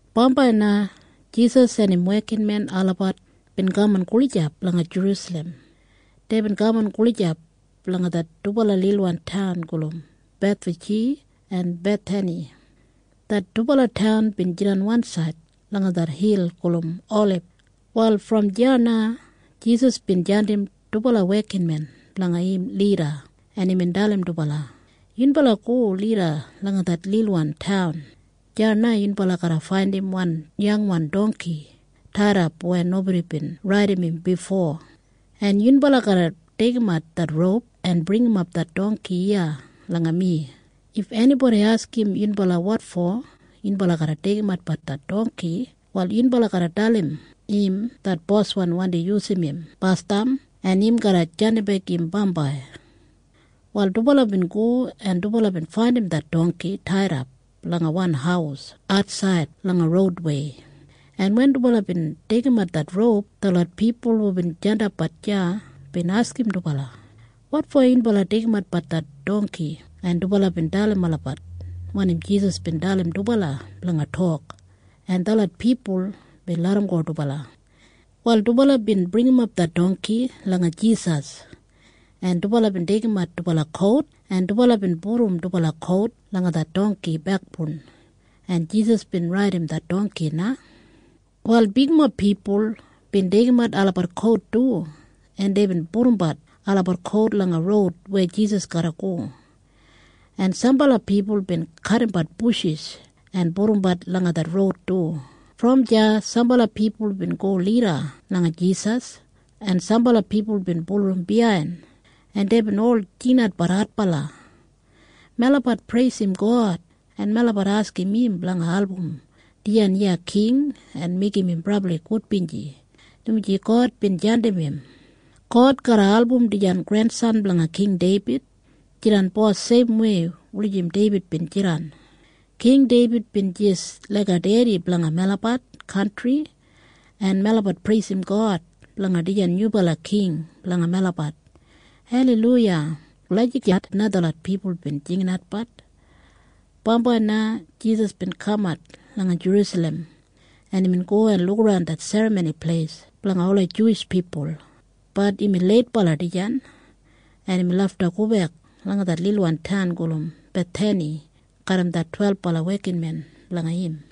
Bambai na Jisas en im wekinmen olabat bin kaman gulijap langa Jerusalem. Deibin kaman gulijap langa det dubala lilwan taun gulum Bethfaji en Bethani. Det dubala taun bin jidan wansaid langa det hil gulum Olib. Wal brom deya na Jisas bin jandim dubala wekinmen blanga im lida, en imbin dalim dubala, “Yunbala go lida langa det lilwan taun. Deya na yunbala garra faindim wan yangwan dongki taidap weya nobodi bin raidim im bifo. En yunbala garra deigimat det roup en bringimap det dongki iya langa mi. If enibodi askim yunbala wotfo yunbala deigimatbat det dongki, wal yunbala garra dalim im det boswan wandi yusum im basdam en im garra jandimbek im bambai.” Wal dubala bin go, en dubala bin faindim det dongki taidap langa wan haus atsaid langa roudwei, en wen dubala bin deigimat det roup, detlot pipul hubin jandapbat deya bin askim dubala, “Wotfo yunbala deigimatbat det dongki?” En dubala bin dalim olabat wanim Jisas bin dalim dubala blanga tok, en detlot pipul bin larramgo dubala. Wal dubala bin bringimap det dongki langa Jisas, en dubala bin deigimat dubala kout, en dubala bin pudum dubala kout langa det dongki bekboun, en Jisas bin raidim det dongki na. Wal bigmob pipul bin deigimat olabat kout du, en deibin pudumbat olabat kout langa roud weya Jisas garra go, en sambala pipul bin kadimbat bushis en pudumbat langa det roud du. Brom deya sambala pipul bin go lida langa Jisas, en sambala pipul bin bulurrum biyain, en deibin ol jinginat adbala, “Melabat preisim God, en melabat askim im blanga album dijan iya king en meigim im brabli gudbinji, dumaji God bin jandim im. God garra album dijan grensan blanga King Deibid jidan bos seimwei jis laik Deibid bin jidan. King Deibid bin jis laiga dedi blanga melabat kantri, en melabat preisim God blanga dijan nyubala King blanga melabat. Aleiluya!” Lagijat na detlot pipul bin jinginatbat. Bambai na Jisas bin kamat langa Jerusalem, en imbin go en lukaran det Serramoni Pleis blanga ola Juwish pipul. Bat imbin leitbala dijan, en imbin lafta gobek langa det lilwan taun gulum Bethani garram det twelbala wekinmen blanga im.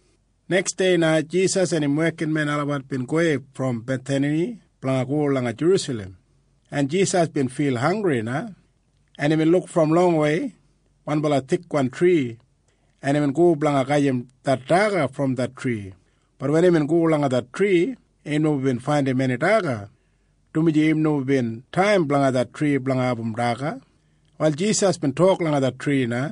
Neksdei na Jisas en im wekinmen olabat bin gowei brom Bethani blanga go langa Jerusalem, en Jisas bin fil hanggri na, en imbin luk brom longwei wanbala fig tri, en imbin go blanga gajim det daga brom det tri. Bat wen imbin go langa det tri, im nomo bin faindim eni daga, oni fo lif, dumaji im nomo bin taim blanga det tri blanga abum daga. Wal Jisas bin tok langa det tri na,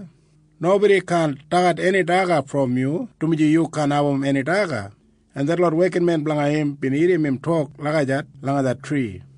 “Nobodi kaan dagat eni daga brom yu, dumaji yu kaan abum eni daga.” En detlot wekinmen blanga im bin irrim im tok lagijat langa det tri.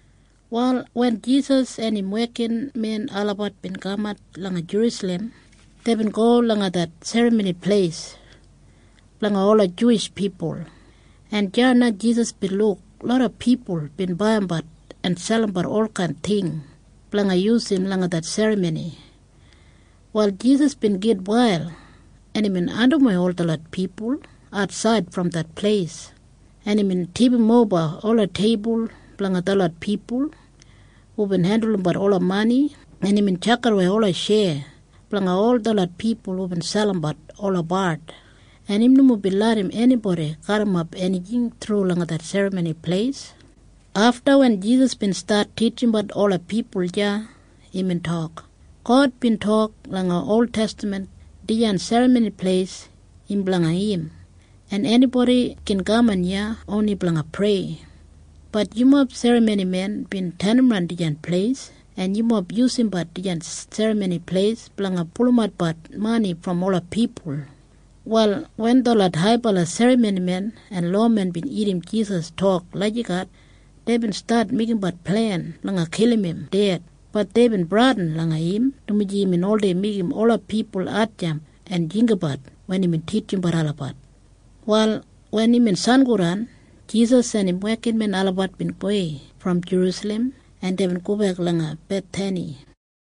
Wal wen Jisas en im wekinmen olabat bin kamat langa Jerusalem, deibin go langa det Serramoni Pleis blanga ola Juwish pipul, en deya na Jisas bin luk loda pipul bin baiyimbat en selimbat olkain ting blanga yusum langa det serramoni. Wal Jisas bin gitwail, en imbin andimwei ol detlot pipul atsaid brom det pleis, en imbin tipimoba ola teibul blanga detlot pipul hubin hendulumbat ola mani, en imbin tjakidawei ola tjeya blanga detlot pipul hubin selimbat ola bard, en im nomo bin larram enibodi garrimap enijing thru langa det Serramoni Pleis. Afta, wen Jisas bin stat titjimbat ola pipul deya, imbin tok, “God bin tok langa oltestaman dijan Serramoni Pleis im blanga im, en enibodi gin kaman iya oni blanga prei. Bat yumob serramonimen bin tenimran dijan pleis, en yumob yusumbat dijan Serramoni Pleis blanga pulumatbat mani brom ola pipul.” Wal wen detlot haibala serramonimen en lowamen bin irrim Jisas tok lagijat, deibin stat meigimbat plen blanga kilim im ded. Bat deibin bradin langa im, dumaji imbin oldei meigim ola pipul hatjamp en jinggabat wen imbin titjimbat olabat. Wal wen imbin sangodan, Jisas en im wekinmen olabat bin gowei brom Jerusalem, en deibin gobek langa Bethani.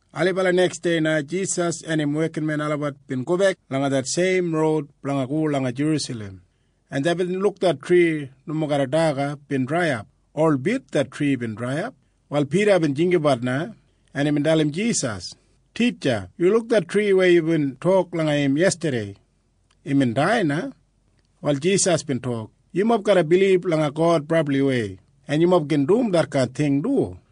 Ailibala neksdei na Jisas en im wekinmen olabat bin gobek langa det seim roud blanga go langa Jerusalem, en deibin luk det tri nomo garram daga bin draiyap. Holbit det tri bin draiyap. Wal Pida bin jinggabat na, en imbin dalim Jisas, “Titja, yu luk det tri weya yubin tok langa im yestadei. Imbin dai na.” Wal Jisas bin tok, “Yumob garra bilib langa God brabliwei, en yumob gin dum detkain ting du.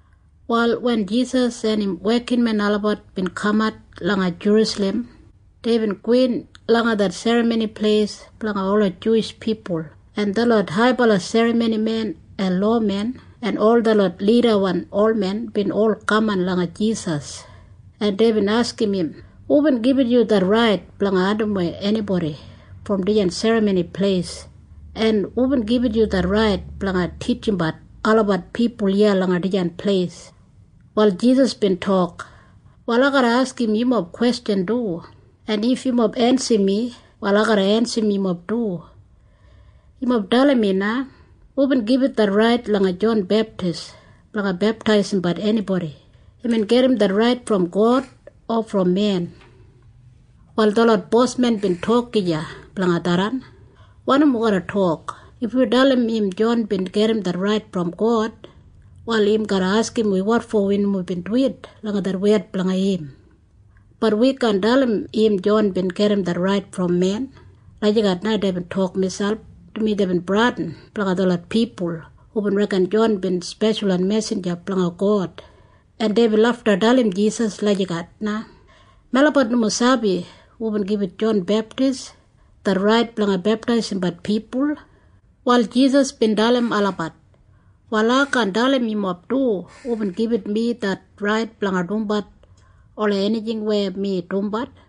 Wal wen Jisas en im wekinmen olabat bin kamat langa Jerusalem, deibin gowin langa det Serramoni Pleis blanga ola Juwish pipul, en detlot haibala serramonimen en lowamen en ol detlot lidamob olmen bin ol kaman langa Jisas, en deibin askim im, “Hubin gibit yu det rait blanga andimwei enibodi brom dijan Serramoni Pleis? En hubin gibit yu det rait blanga titjimbat ola pipul iya langa dijan pleis?” Wal Jisas bin tok, “Wal ai garra askim yumob kwestjan du. En if yumob ensim mi, wal ai garra ensim yumob du. Yumob dalim mi na. Hubin gibit det rait langa Jon Beptis blanga beptaisimbat enibodi? Imbin gedim det rait brom God o brom men?” Wal detlot bosmen bin tok gija blanga tharran, “Wanim wi garra tok? If wi dalim im Jon bin gedim det rait brom God, wal im garra askim wi wotfo wi nomo bin duwit langa det wed blanga im. Bat wi kaan dalim im Jon bin gedim det rait brom men.” Lagijat na deibin tok miselp, dumaji deibin bradin blanga detlot pipul hubin reken Jon bin speshalwan mesinja blanga God. En deibin lafta dalim Jisas lagijat na, “Melabat nomo sabi hubin gibit Jon Beptis det rait blanga beptaisimbat pipul.” Wal Jisas bin dalim olabat, “Wal ai kaan dalim yumob du hubin gibit mi det rait blanga dumbat ola enijing weya mi dumbat.”